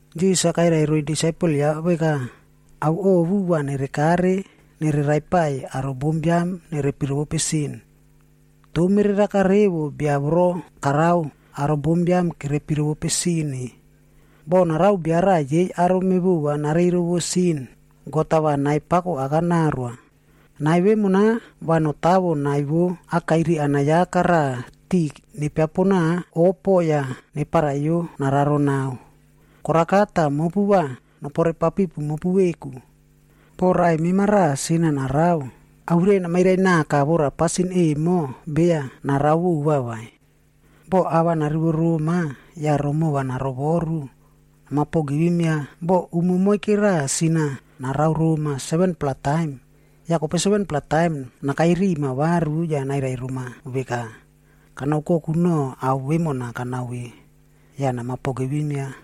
Jisas-a kairai roiy disaipel ya veka, “Ao ovu va nerekare va nere raipaiy aro bombiam nerepi rovope sin. Toh mereraka revo bia voro karao aro bombiam kerepi rovope sin-e. Boh narao bia raꞌa yei aro mevova nareiy rovore sin, God-a va nai pako aka naoroa. Nai vemona va notawo nai vo akairi anayaka raꞌa tiꞌi nepiaponao opo yah neparaiyo nararo nao. “Koraka tah mopu va nopore papipu mopu veku. “Boh raꞌai mema raꞌa sin-a narao, awirai namairai naka vora pasin emo beya narao vova vai. Boh ava narivo roma, yah romova narovoru, nama pogivim ya. Boh umo moike raꞌa, sin-a narao roma 7-pla taim, yah kope 7-pla taim nakai rima varu yah nairai roma veka, ‘Kana oukoku noꞌo ao vemona kanao ve,’ yah nama pogivim ya.”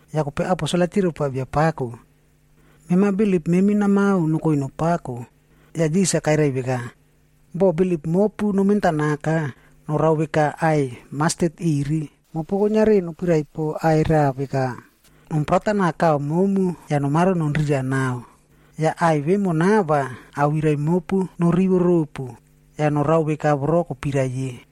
Yah kope aposel-a kirai poa Biapako, “Mema bilip memi namao nokoi nopako.” Yah Jisas-a kairai veka, “Boh bilip mopu nomentanaka, norao veka aꞌai mastet iri,a mopu kuiniari nopirai po aꞌai raꞌa veka, ‘Nom prata nao kaꞌa momu, yah nomaro nonrira nao.’ Yah aꞌai vemona va awirai mopu norivo ropu, yah norao veka voro kopirai ye.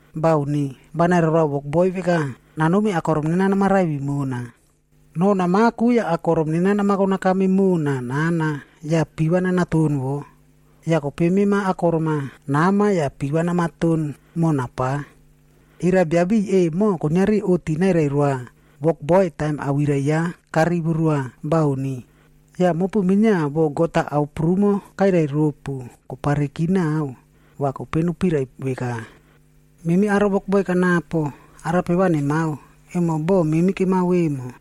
Bauni. Va nairai roa wokboi veka, ‘Nanomi akorom nena namaraivi mona, noh namaku yah akorom nena namako nakame mona nana yah piva nanaton wo, yah kope mema akorom-a nama yah piva namaton mona pa.’ Era biabiꞌiy emo, kuiniari oꞌti nairai roa wokboi taim awirai ya karivo roa? Bauni. Yah mopu minia, boh God-a ao prumo kairai ropu kopareki nao, va kope nopirai veka, ‘Memi aro wokboi kanapo, arape va nemao, emo boꞌo memi kemao vemo.’”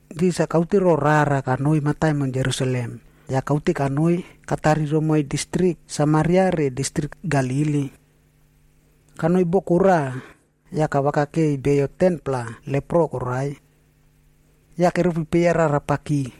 Jisas-a kaute roꞌo rara konoi mataimon Jerusalem, yah kaute kanoi katari romoiy distrik Samaria re distrik Galili. Kanoi boko raꞌa, yah kavakakeiy beyo 10-pla lepro koraiy. Yah keropi peya rarapaki,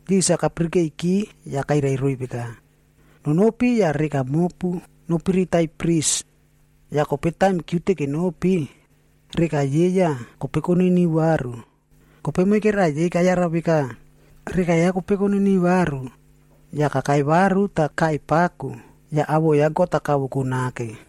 Jisas-a kapirikeiki yah kairai roiy veka, “Nonopi yah reka mopu nopiritaiy pris.”d Yah kope taim kiute kenopi, reka yei yah kope koniniu varu. Kope moike raꞌa yei kayara veka, reka ya kope koniniu varu, yah kakai varu tah kaꞌai pako yah awoꞌo ya God-a kavoko nake.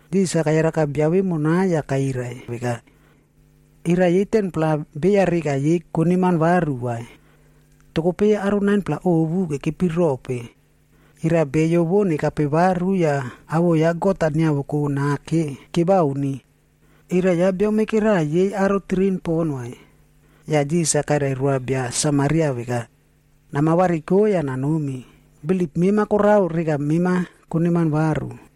Jisas-a kayaraka bia vemona yah kairai veka, “Era yei 10-pla beya reka yei koneman varu vai? Toh kope yei aro 9-pla ovu kekepi rope? Era beyo vo nekape varu yah awoꞌo ya God-a niavoko nake, kebauni? Era ya bia moike raꞌa yei aro tirin pon vai?” Yah Jisas-a kairai roa bia Samaria veka, “Nama variko yah nanomi, bilip mema korao reka mema koneman varu.”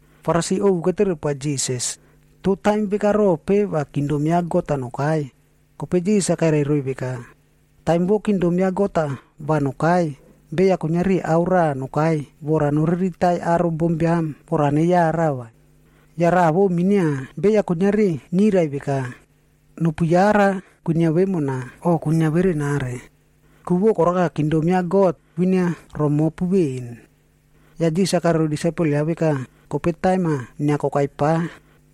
Farisi ovu ketere poa Jisas, “Toh taim veka rope va kingdom ya God-a nokai?” Kope Jisas-a kairai roiy veka, “Taim vo kingdom ya God-a va nokai, beya kuiniari ao raꞌa nokai vora noriritaiy aro bombiam vora neyara vai. Yah raꞌa vo minia, beya kuiniari niyrai veka, ‘Nopu yara, kwinia vemona’, o ‘Kwinia verenare.’ Ku vo koraka, kingdom ya God kwinia romopu veꞌen.” Yah Jisas-a kairai roiy disaipel ya veka, “Kope taim-a inia kokai pa,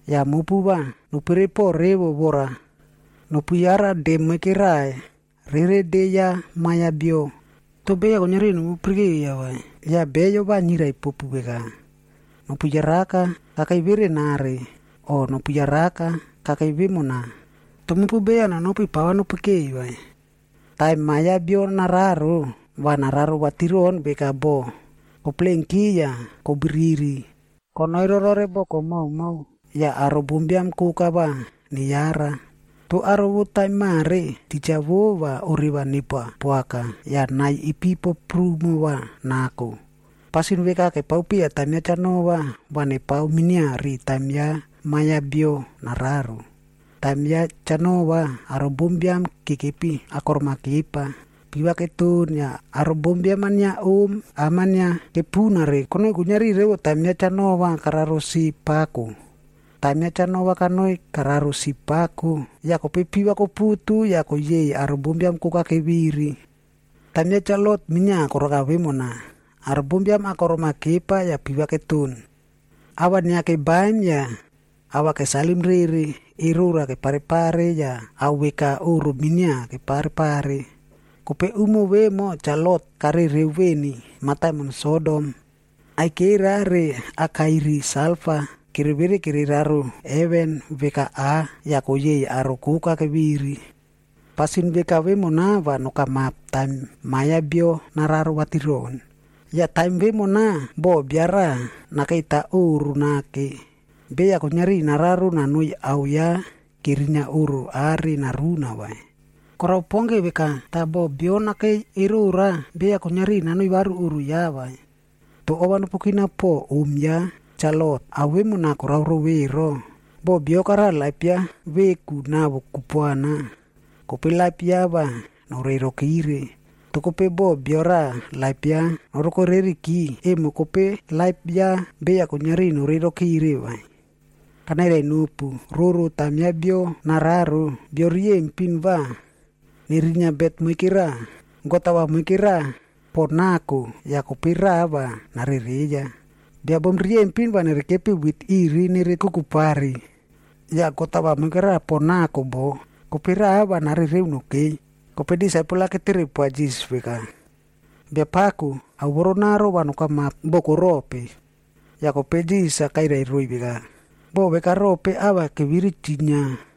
yah mopu va nopere po revo vora nopu yara de moike raꞌa rere de ya Ma Biam ya Bio. Toh beya kuiniari nopu pirikeiya vai. Yah beyo va niyrai popu veka, ‘Nopu yaraka. Kakei verenare!’ o ‘Nopu yaraka. Kakei vemona!’ Toh mopu beya nonopi pava nopikei vai. Taim Ma Biam ya Bio nararo, va nararo vatiron veka bo koplenki yah kobiriri konoi rorore boko moumou yah aro bombiam koka va neyara. Toh aro vo taim mare, titja vo va oreva nepoa poaka, yah nai ipipo prumo va nako. “Pasin veka kepao piya taim ya Cha Noa,e va nepao minia ri taim ya Ma Biam ya Bio nararo. Taim ya Cha Noa, aro bombiam-a kekepi akorom-a kepa, piva keton yah aro bombiam-a inia om, am-a inia kepunare konoi kuiniari revo taim ya Cha Noa kararo sip pako. Taim Cha Noa kanoi kararo sip pako, yah kope piva koputu yah koyeiy aro bombiam koka keviri. “Taim ya Cha Lotf minia koraka vemona. Aro bombiam akorom-a kepa yah piva keton, ava inia kebaim yah ava kesalim rere, erora kepare pare yah ao veka oꞌro minia kepare pare. Kope umo vemo Cha Lot karereo veni mataimon Sodom, aikera re akairi salfa kere vere kere raro heven veka aꞌ yah koyeiy aro koka keviri. “Pasin veka vemona va nokamap taim Ma Biam ya Bio nararo vatiron. Yah taim vemona, boh bio raꞌa nakeita oꞌro nake,g beya kuiniari nararo nanoi ao ya kerinia oꞌro are naruna vai. Korao pon ke veka, tah boh bio nakei erora, beya kuiniari nanoi varu oꞌro ya vai. Toh ova nopu kina po om ya Cha Lot,h ao vemona korao rou ero! Boh, bio karao laip ya veku nawo kupuana, kope laip ya va noreiy rokire. Toh kope boh bio raꞌa laip ya naroko reriki, emo kope laip ya beya kuiniari noreirokire vai. “Kanairai nopu, roro taim Ma ya Bio nararo, bio riyempin va nerinia bet moike raꞌa, God-a va moike raꞌa pon nako ya, kope raꞌa va narereiya. Bia bom riyempin va nere kepi wit iri nere kukupari, yah God-a va moikera pon nako bo, kope raꞌa va narereo nokei.” Yah disaipel-a ketere poa Jisas veka, “Biapako, ao vorona va nokamap boko rope?” Yah kope Jisas-a kairai roiy veka, “Boko veka rope ava keviri chinia,